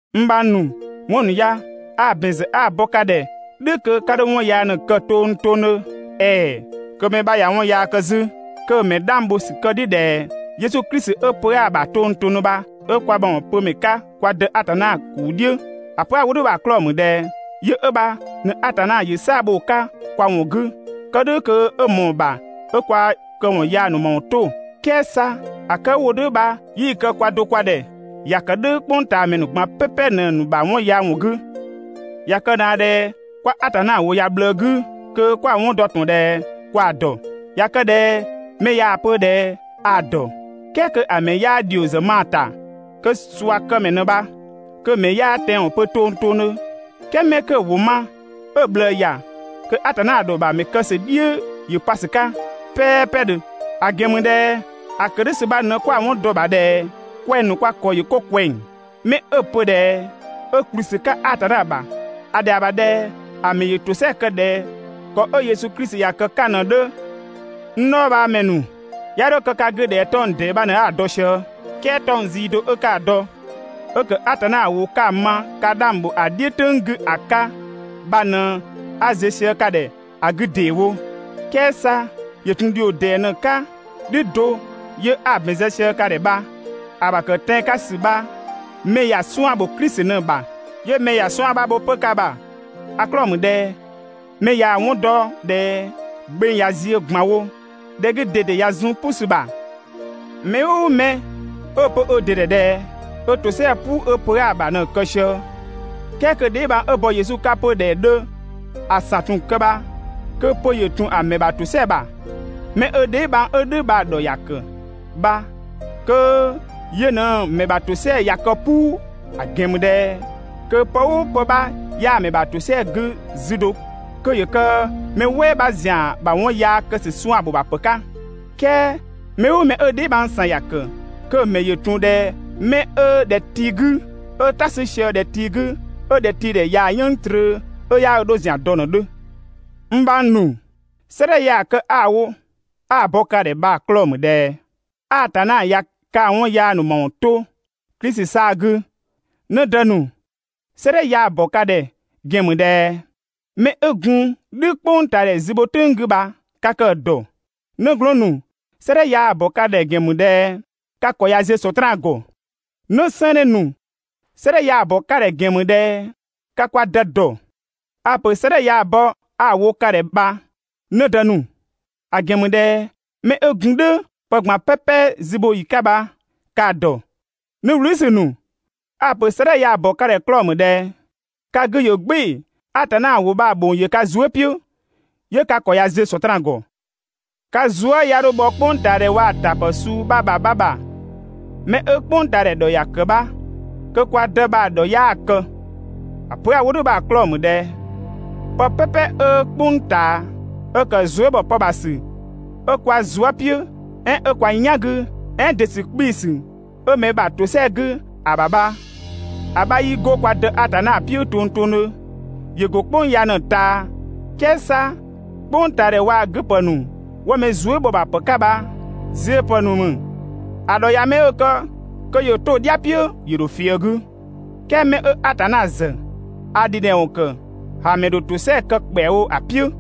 N bhang ‑nu, 'wɔn ‑nu ya a‑ ‑bɛn ‑zë 'a‑ bɔ ka ꞊dhɛ "dhʋ̈ kö 'ka 'dho 'wɔn yaa ꞊në‑ kë tongtongdhö. ‑Ɛɛ! Kö mɛ 'bha ꞊ya 'wɔn yaa kë 'zü, kö‑ ‑mɛ 'dhang bho ‑sü kë‑ "dhiʋ̈ ꞊dhɛ Yesu Klisi 'ö pö 'aa‑ ‑bha tongtongdhö bha ꞊në kwa ‑mawɔn pö ‑mɛ 'ka kwa Dë Atanna ‑kuu "dhiʋ̈. ‑A pö 'a‑ wo "dhʋ̈ bha‑ 'klɔɔ‑ ‑mü ꞊dhɛ yö 'ö bha ꞊në Atanna ‑yö "saa‑ bho‑ 'ka kwa ‑wɔn 'gü, kë "dhʋ̈ kö 'ö ꞊mɔɔ‑ ‑bha 'ö kwa këwɔn yaa ‑nu ‑mawɔn 'to. "Kɛɛ 'sa ‑a kë 'ö‑ wo "dhʋ̈ bha 'yii‑ kë kwaa do kwa ‑dhɛ. ‑Ya ‑kë "dhʋ̈ "kpʋngtaamɛ ‑nu ꞊gban "pɛpɛ ꞊në‑ ‑nu ‑bha 'wɔn yaa ‑wɔn 'gü. ꞊Ya kë ꞊naa ꞊dhɛ 'kwa Atanna ‑wʋ ‑ya ꞊bhlëë 'gü kö 'kwa‑ 'wɔn dɔ ꞊tɔn ꞊dhɛ kwa‑ ‑dɔ. ꞊Ya kë ꞊dhɛ mɛ ꞊yaa‑ pö ꞊dhɛ a‑ ‑dɔ, "kɛɛ kö ‑a ‑mɛ 'yaa ‑dhio ‑zë ma‑ ‑ta, kö ꞊suakëmɛ ꞊në bha, kö‑ ‑mɛ 'yaa tɛanwɔn pö tongtongdhö. "Kɛɛ 'mɛ 'kö‑ ‑wʋ ma, 'ö‑ ꞊bhlëë ‑ya, kö Atanna ‑dhɔ ‑bha ‑a ‑mɛ kë ‑sü bha‑ "dhiʋ̈ ‑yö pa ‑sü 'ka "pɛɛpɛdhö. ‑A ‑gɛn ‑mü ꞊dhɛ ‑a ‑kë "dhʋ̈ ‑sü bha ꞊në 'kwa‑ 'wɔn dɔ‑ ‑bha ꞊dhɛ kwɛng‑ ‑nu kwa ‑kɔ ‑yö 'ko ꞊kwɛng. 'Mɛ 'ö‑ pö ꞊dhɛ 'ö ‑kplü ‑sü 'ka Atanna ‑bha, ‑a ‑dhɛa ‑bha ꞊dhɛ ‑a ‑mɛ ‑yö ‑tosɛa kë ꞊dhɛ ‑kɔ 'ö Yesu Klisi ‑ya kë‑ 'ka‑ ꞊në‑ 'dhö. N dhɔɔbhaamɛ ‑nu, 'ya 'dho kë ka 'gü ꞊dhɛ 'tɔng‑ ‑dee 'bha ꞊në 'a‑ dɔ sië, "Kɛɛ 'tɔng‑ zii do 'ö 'ka‑ dɔ, 'ö ‑kë Atanna ‑wʋ 'ka‑ ma ka 'dhang ‑bho ‑a "dhiʋ̈ "tʋ̈ng 'gü ‑a 'ka bha ꞊në 'a ziö sië ka ‑dhɛ ‑a 'gü ‑deewo. "Kɛɛ 'sa ‑yö ‑tun ‑dhio ‑dee ꞊në‑ 'ka "dhʋ̈ do 'yö 'a‑ ‑bɛn zë sië ka ‑dhɛ bha. ‑A ‑bha ‑kë tɛan‑ 'ka ‑sü bha mɛ ‑ya 'suan‑ ‑bho Klisi ꞊në‑ ‑bha, 'yö mɛ ‑ya 'suan‑ 'bha bho 'pö ka ‑bha. ‑A 'klɔɔ‑ ‑mü ꞊dhɛ mɛ ꞊yaa‑ 'wɔn dɔ ꞊dhɛ gbeng ꞊ya ziö ꞊gban wo, ‑dhɛ 'gü ꞊dede ꞊ya zun "pʋ ‑sü ‑bha. Mɛ "ʋʋ mɛ 'ö‑ pö ö ‑dɩ ‑dhɛ ꞊dhɛ ö ‑tosɛa "puu 'ö pö 'aa‑ ‑bha ꞊në‑ kë sië, "kɛɛ kö‑ dheebhang 'ö bɔ Yesu 'ka 'pö ꞊dhɛ‑ 'dhö ‑a ‑san ‑tun kë bha kö pö ‑yö ‑tun ‑a ‑mɛ ‑bha ‑tosɛa ‑bha. 'Mɛ 'ö‑ dheebhang 'ö "dhʋ̈ bha‑ ‑dhɔ ‑ya ‑kë bha kö yö ꞊në‑ ‑mɛ ‑bha ‑tosɛa ꞊ya kë "puu, ‑a ‑gɛn ‑mü ꞊dhɛ kö pë "ʋʋ pë 'bha 'yaa‑ ‑mɛ ‑bha ‑tosɛa 'gü 'zü do kö ‑yö kë mɛ "wɛɛ 'bha ‑zian ‑bha 'wɔn yaa kë ‑sü 'suan‑ ‑bho ‑bha ‑pë 'ka. "Kɛɛ mɛ "ʋʋ mɛ 'ö‑ dheebhang ‑san ‑ya ‑kë, kö‑ ‑mɛ ‑yö ‑tun ꞊dhɛ 'mɛ 'ö ‑dhɛ tii 'gü, 'ö "ta 'sü sië ‑dhɛ tii 'gü, 'ö ‑dhɛtiidhɛ ꞊yaa‑ "yënng trö 'ö 'yaa ö dho ‑zian dɔ ꞊në‑ 'dhö. N bhang ‑nu, 'sëëdhɛ ya‑ kë 'a‑ wo 'a‑ bɔ ka ‑dhɛ bha‑ 'klɔɔ‑ ‑mü ꞊dhɛ Atanna ꞊ya kaa‑ 'wɔn yaa ‑nu ‑mawɔn 'to Klisi 'saa‑ 'gü. 'Në dë ‑nu, 'sëëdhɛ ya‑ ‑bɔ ka ‑dhɛ ‑gɛn ‑mü ꞊dhɛ 'mɛ 'ö gun "dhʋ̈ "kpʋngtaadhɛ zü bho "tʋ̈ng 'gü bha ka kë‑ ‑dɔ. 'Nëglɔɔn ‑nu, 'sëëdhɛ ya‑ ‑bɔ ka ‑dhɛ ‑gɛn ‑mü ꞊dhɛ ka ‑kɔ ꞊ya ziö Sɔtraan ‑gɔ. 'Në 'sɛɛnnë ‑nu, 'sëëdhɛ ya‑ ‑bɔ ka ‑dhɛ ‑gɛn ‑mü ꞊dhɛ ka kwa Dë ‑dɔ. A‑ ‑pö 'sëëdhɛ ya‑ bɔ 'a‑ wo ka ‑dhɛ bha, 'në dë ‑nu, ‑a ‑gɛn ‑mü ꞊dhɛ 'mɛ 'ö gun "dhʋ̈ pë ꞊gban "pɛpɛ zü bho ‑yi 'ka bha ka‑ ‑dɔ. 'Në wlüüsü ‑nu, a‑ ‑pö 'sëëdhɛ ya‑ ‑bɔ ka ‑dhɛ 'klɔɔ‑ ‑mü ꞊dhɛ ka 'gü ‑yö "gbɩɩ‑, Atanna ‑wʋ bha‑ ‑bhong ‑yö ka zuë" "piʋ̈, 'yö ka ‑kɔ ꞊ya ziö Sɔtraan ‑gɔ. Ka Zuë" 'ya 'dho bhɔ "kpʋngtaadhɛ waa‑ ‑tapë suu 'bha ‑bha 'bha ‑bha. Mɛ 'ö "kpʋngtaadhɛ ‑dhɔ ‑ya ‑kë bha kö kwa Dë bha‑ ‑dhɔ 'yaa‑ kë. ‑A pö 'a‑ wo "dhʋ̈ bha‑ 'klɔɔ‑ ‑mü ꞊dhɛ pë "pɛpɛ 'ö "kpʋng ꞊taa, 'ö ‑kë zuë" ‑bhɔ pë ‑bha ‑sü 'ö kwa zuë" "piʋ̈, "ɛɛn 'ö kwa "yan 'gü, "ɛɛn ‑dɩ ‑sü 'kpii‑ ‑sü 'ö mɛ ‑bha ‑tosɛa 'gü ‑a ‑bha bha, ‑a 'bha 'yii 'go kwa Dë Atanna "piʋ̈ tongtongdhö; ‑yö ‑go "kpʋng ya ꞊në‑ ꞊taa. "Kɛɛ 'sa "kpʋngtaadhɛ waa‑ 'gü ‑pë ‑nu 'wo mɛ zuë" ‑bhɔ ‑bha ‑pë 'ka bha ziö ‑pë ‑nu ‑mü, ‑a ‑dhɔ ꞊ya 'mɛ 'ö‑ kë kö ‑yö 'to‑ "dhia "piʋ̈ ‑yö ‑dho fië‑ 'gü, "kɛɛ 'mɛ 'ö Atanna ‑zë ‑a ‑dhidhɛwɔn ‑kë, ‑a ‑mɛ ‑dho ‑tosɛa kë ‑kpɛawo ‑a "piʋ̈.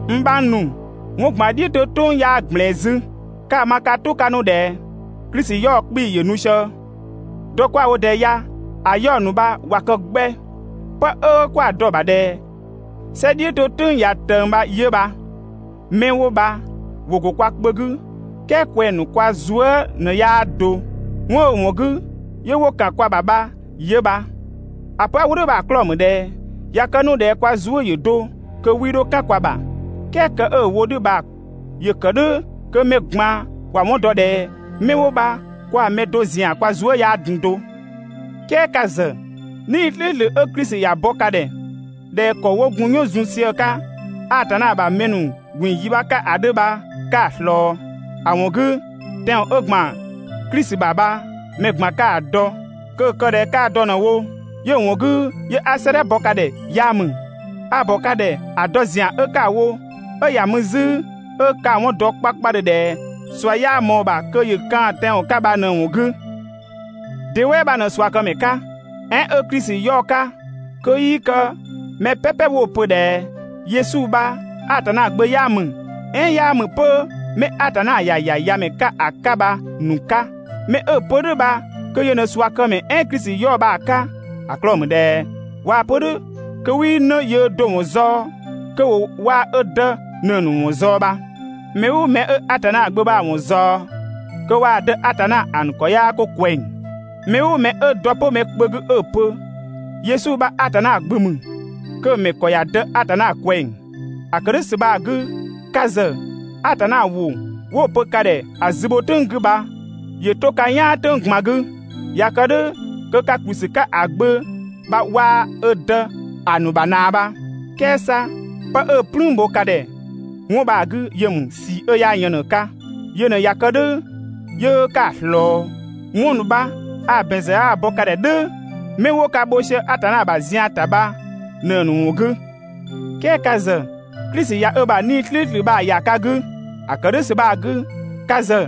N bhang ‑nu, ‑wɔn ꞊gban "dhiʋ̈ 'to "tʋ̈ng 'yaa ꞊gblɛɛn 'zü. 'Ka‑ ma ka "tʋ 'ka 'nu ꞊dhɛ Klisi 'yaɔ‑ 'kpii‑ ‑yö nu sië, dɔ 'kwa‑ wo ꞊dɛɛ ya‑ 'yaɔ‑ ‑nu bha ꞊wa kë 'gbɛ. 'Pë 'ö 'kwa‑ dɔ‑ ‑bha ꞊dhɛ "sɛ "dhiʋ̈ 'to "tʋ̈ng ꞊ya ꞊tëng bha 'yö bha. 'Mɛ 'wo bha ‑wo ‑go kwa kpö 'gü, "kɛɛ kwɛng‑ ‑nu kwa zuë" ꞊në 'yaa do, 'wɔn 'ö‑ ‑wɔn 'gü 'yö 'wo ‑kan kwa ‑bha bha 'yö bha. ‑A pö 'a‑ wo "dhʋ̈ bha‑ 'klɔɔ‑ ‑mü ꞊dhɛ ꞊ya kë 'nu ꞊dhɛ kwa zuë" ‑yö do, kö 'wii 'dho "kan kwa ‑bha. "Kɛɛ kë 'ö‑ wo "dhʋ̈ bha ‑yö ‑kë "dhʋ̈ kö mɛ ꞊gban ‑wa 'wɔn dɔ ꞊dhɛ 'mɛ 'wo bha kwaa‑ mɛ do ‑zian kwa zuë" 'yaa gun do. "Kɛɛ ka ‑zë, 'Nii‑ "slʋ̈ʋ̈slʋ̈ 'ö Klisi ‑ya bɔ ka ‑dhɛ ꞊dhɛ ‑kɔ 'wo gun "yɔn zun sië‑ 'ka Atanna ‑bha mɛ ‑nu ꞊gbin‑ yi 'bha 'ka ‑a 'dhö bha 'ka‑ ꞊slɔɔ. ‑A ‑wɔn 'gü, tɛanwɔn 'ö ‑gban Klisi ‑bha bha mɛ ꞊gban ka‑ ‑dɔ. Kö‑ ‑kë ꞊dhɛ 'kaa‑ dɔ ꞊në wo 'yö‑ ‑wɔn 'gü 'yö 'a 'sëëdhɛ bɔ ka ‑dhɛ 'yaa ‑mü. A‑ ‑bɔ ka ‑dhɛ ‑a dɔ ‑zian 'ö 'ka‑ wo, 'ö ‑ya mü 'zü 'ö 'ka‑ 'wɔn ‑dɔ 'kpakpadhö ꞊dhɛ ꞊sua 'yaa ꞊mɔɔ‑ ‑bha kö ‑yö kaan‑ tɛanwɔn 'ka bha ꞊në‑ ‑wɔn 'gü. De "wɛɛ 'bha ꞊në ꞊suakëmɛ 'ka, "ɛɛn 'ö Klisi 'yaɔ‑ 'ka kö 'yii kë mɛ "pɛpɛ 'wo‑ pö ꞊dhɛ Yesu bha Atanna Gbö 'yaa ‑mü, "ɛɛn 'yaa ‑mü 'pö 'mɛ Atanna ‑ya ‑ya ‑Yamɛ 'ka ‑a 'ka bha‑ ‑nu 'ka? 'Mɛ 'ö‑ pö "dhʋ̈ bha kö yö ꞊në ꞊suakëmɛ "ɛɛn Klisi 'yaɔ‑ bha‑ 'ka, ‑a 'klɔɔ‑ ‑mü ꞊dhɛ ꞊waa‑ pö "dhʋ̈ kö 'wii 'në yöö do‑ ‑wɔn zaɔ‑, kö ‑wo waa‑ ö Dë ꞊në‑ ‑nu ‑wɔn ꞊zaɔ bha. Mɛ "ʋʋ mɛ 'ö Atanna Gbö bha‑ ‑wɔn ꞊zaɔ, kö waa‑ Dë Atanna ‑a ‑nu ‑kɔ 'yaa 'ko ꞊kwɛng. Mɛ "ʋʋ mɛ 'ö dɔ 'pö mɛ kpö 'gü 'ö‑ pö Yesu bha Atanna Gbö ‑mü, kö‑ ‑mɛ ‑kɔ ‑ya De Atanna ꞊kwɛng. ‑A ‑kë "dhʋ̈ ‑sü bha‑ 'gü, ka ‑zë Atanna ‑wʋ 'wo‑ pö ka ‑dhɛ ‑a zü bho "tʋ̈ng 'gü bha ‑yö 'to ka "yaan "tʋ̈ng ꞊gban 'gü. ꞊Ya kë "dhʋ̈ kö ka ‑kplü ‑sü 'ka ‑a Gbö bha waa‑ ö Dë ‑a ‑nu ‑bha ꞊naa bha. "Kɛɛ 'sa 'pë 'ö‑ "plüün bho ka ‑dhɛ 'wɔn bha‑ 'gü yö ‑mü ꞊sii 'ö 'yaa yën ꞊në‑ 'ka. Yö ꞊në ꞊ya kë "dhʋ̈ 'yö 'ka‑ ꞊slɔɔ. 'Wɔn ‑nu bha a‑ ‑bɛn ‑zë 'a‑ bɔ ka ‑dhɛ "dhʋ̈ 'mɛ 'wo ka bho sië Atanna ‑bha zian ‑ta bha ꞊në‑ ‑nu ‑wɔn 'gü. "Kɛɛ ka ‑zë, Klisi ꞊ya ö ‑bha 'Nii‑ "slʋ̈ʋ̈slʋ̈ bha‑ ‑ya ka 'gü. ‑A ‑kë "dhʋ̈ ‑sü bha‑ 'gü, ka ‑zë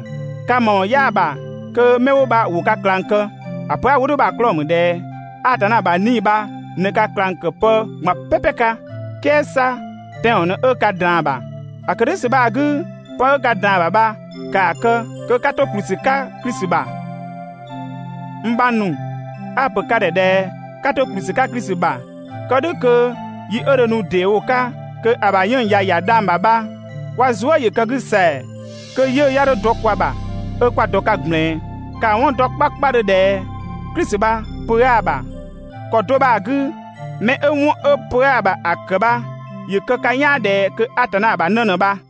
ka ‑mawɔn 'yaa‑ ‑bha kö 'mɛ 'wo bha ‑wo ka ꞊klang kë. ‑A pö 'a‑ wo "dhʋ̈ bha‑ 'klɔɔ‑ ‑mü ꞊dhɛ Atanna ‑bha 'Nii‑ bha ꞊në ka ꞊klang ‑kë pë ꞊gban "pɛpɛ 'ka, "kɛɛ 'sa tɛanwɔn ꞊në 'ö ka ꞊draan‑ bha. ‑A ‑kë "dhʋ̈ ‑sü bha‑ 'gü, 'pë 'ö ka ꞊draan‑ ‑bha bha ‑kaa kë, kö 'ka 'to ‑kplü ‑sü 'ka Klisi ‑bha. N bhang ‑nu, a‑ ‑pö ka ‑dhɛ ꞊dhɛ 'ka 'to ‑kplü ‑sü 'ka Klisi ‑bha kë "dhʋ̈ kö yi 'ö dho nu ‑dee wo‑ 'ka kö ‑a ‑bha 'yënng‑ ꞊ya ‑ya dhang‑ ‑bha bha kwa zuë" ‑yö kë‑ 'gü ‑sɛa, kö 'yiʋ̈‑ 'ya 'dho dɔ kwa ‑bha 'ö 'kwa dɔ‑ 'ka ꞊gblɛɛn. Ka‑ 'wɔn ‑dɔ 'kpakpadhö ꞊dhɛ Klisi bha pö 'aa‑ ‑bha. ‑Kɔ do bha‑ 'gü, 'mɛ 'ö 'wɔn 'ö pö 'aa‑ ‑bha ‑a ‑kë bha, ‑yö kë ka "yaan ꞊dhɛ kö Atanna ‑bha 'në ꞊në bha.